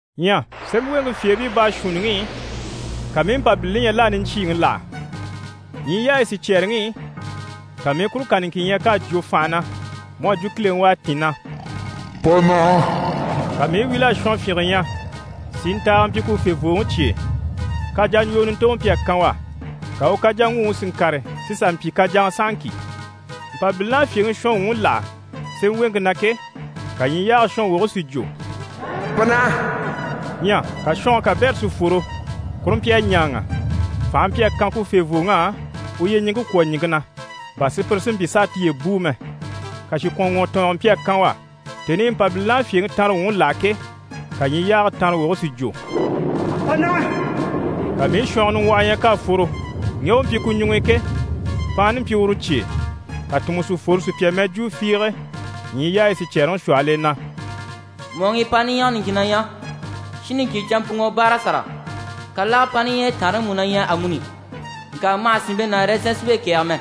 Ɲyɛ sémɛweŋke fyèebii baashuunniŋi i, ka mii i Mpabilini ɲya l'à niɲcyiiŋi láha. Ɲyii yaayi sicyɛɛreŋi i, ka mii i kuru kà niŋkin ɲya k'à jwo fànha na mu à jwo kileŋi u à tîn, na: «Pa naha!» Ka mii i wíl'a shɔnfyinge ɲya, sintaaga mpyi ku fèvooŋi cye e. Kajaɲjwoo nintoŋɔ mpyi a kan u á, ka u kajaŋguŋi si ŋkàre si sà mpyi kajaŋa sahaŋki. Mpabilini à fyèŋi shɔnwuŋi láha sémɛweŋke na ke, ka ɲyii yaage shɔnwoge si jwo: «Pa naha!» Ɲyɛ ka shɔnge kabɛrɛ si fworo. Kuru mpyi a ɲáaŋa. Fànhe mpyi a kan ku fèvooŋ'á u yyeɲiŋke kwɔ̀ ɲìŋke na, bà sùpyire si mpyi s'a tiye bùu mɛ. Kàshikwɔnŋwɔtɔɔngɔ mpyi a kan u á. Tèni i Mpabilini à fyèŋi tanrewuŋi láha ke, ka ɲyii yaage tanrawoge si jwo: «Pa naha!» Ka mii i shɔngɔ niŋgwɔhɔ ɲya k'à fworo. Ŋge u mpyi ku ɲuŋ'i ke, paanni mpyi uru cye e. Ka tùnmɔ si fworo sùpya mɛjwuu fiige ɲyii yaayi sicyɛɛreŋi shwɔhɔl'e na: «Mɔ̀ɔŋi paanni ɲyɛge niŋkinŋi na ɲyɛ shin niŋkin canmpuŋɔ báara sàra. Kàlage paanni ɲyɛyi taanreŋi mú na ɲyɛ amuni. Ŋka ma hà sìnmpe ná ɛrɛzɛn sinmpe kɛ̀ɛge mɛ.»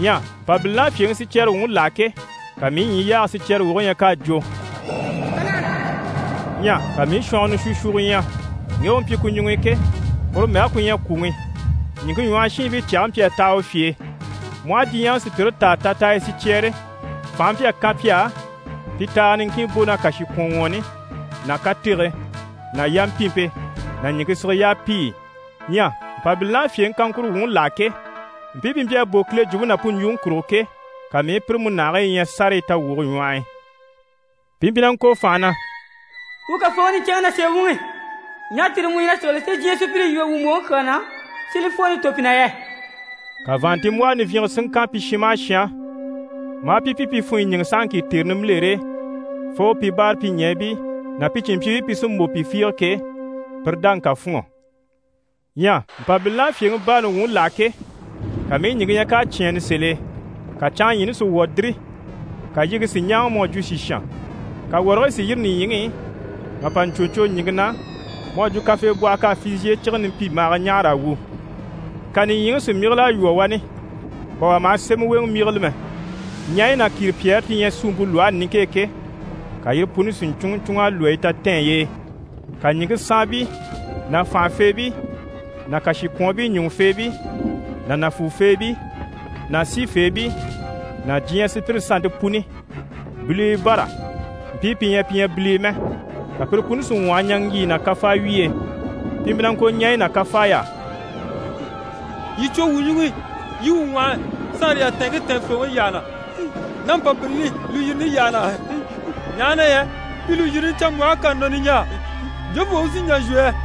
Ɲyɛ Mpabilini à fyèŋi sicyɛrewuŋi láha ke, ka mii i ɲyii yaage sicyɛrewoge ɲya k'à jwo: «Pa naha!» Ɲyɛ ka mii i shɔngɔ nishwushwugo ɲya. Ŋge u mpyi ku ɲuŋ'i ke, uru mɛge ku ɲyɛ Kwùŋi. Ɲìŋke ɲwɔhɔ shiinbii cyage mpyi a taha u fye e. Mu aha diɲyɛŋi sùpyire táa tataaya sicyɛɛre, fànhe mpyi a kan pi á, pi taaga niŋkin bò ná kàshikwɔnŋwɔɔni ná katege ná yampimpe ná ɲìŋke sige yapiyi i. Ɲyɛ Mpabilini à fyèŋi kaŋkuro wuŋi láha ke, mpii pi mpyi a bò Kile jwumpe ná pu ɲjwuŋi kurugo ke, ka mii i pire múnahigii ɲya sárayi tawwuge ɲwɔh'i. Pi mpyi na ŋko fànha na: «Wuu Kafooŋi niɲcɛnŋi ná sèe wuŋi, ɲaha tère mu ɲyɛ na sigili si diɲyɛ sùpyire yíbe wuu mbòŋi kyaa na, si li fwooni tò pi na yɛ?» Ka vàanntinmbwɔhɔ nivyinge si ŋkan pi shin maha shin á, maa pi pyi pi funɲyi ɲíŋɛ sahaŋki tère nimbilere e fo pi báarapyiɲɛɛbii ná cìnmpyiibii pi sí n-bò pi fiige ke, pire dáŋi ká fûnŋɔ. Ɲyɛ Mpabilini à fyèŋi baani wuŋi láha ke, ka mii i ɲìŋke ɲya k'à cyɛ̂ɛnnɛ sèl'e. Ka canŋaɲyiini si wwɔ̀ diri, ka yiŋke si ɲáaŋa mu à jwo sìshan. Ka wɔrigii si yîri nìɲyiŋi i mà pa ɲcwo ɲcwo ɲìŋke na mu à jwo kafeebwɔhɔ k'à fizhiye cige nimpimbaaga ɲâhara a wwû. Ka nìɲyiŋi si myígil'a lwɔ́ wani, bà wà maha sémɛweŋɛ myígile mɛ. Ɲaɲyi ná kìripyɛɛre ti ɲyɛ suumpe lwɔhe niŋke e ke, ka yire puni si ɲcúnŋɔ ɲcúnŋ'a lwɔ́ yi tatɛɛny'e. Ka ɲìŋke saanbii ná fànhafeebii ná kàshikwɔɔnbii ɲùŋufeebii ná nàfuufeebii ná sifeebii ná diɲyɛ sùpyire sannte puni, bilibii bâra mpii pi ɲyɛ pi ɲyɛ bilii mɛ, ka pire puni si ŋwɔhɔ ɲaŋgyiyi ná kafawyiy'e. Pi mpyi na ŋko ɲaɲyi ná kafaay'á: «Yii cwo wuu ɲuŋ'i, yii wuu ŋwɔhɔ saanre yatɛɛnŋke tɛɛnfooŋi yyaha na, ná Mpabilini lùyirini yyaha na. Ɲaha na yɛ pi lùyirini canmbwɔhe k'à nɔ niɲjaa, jofoo u si n‑jà n‑shwɔ yɛ?»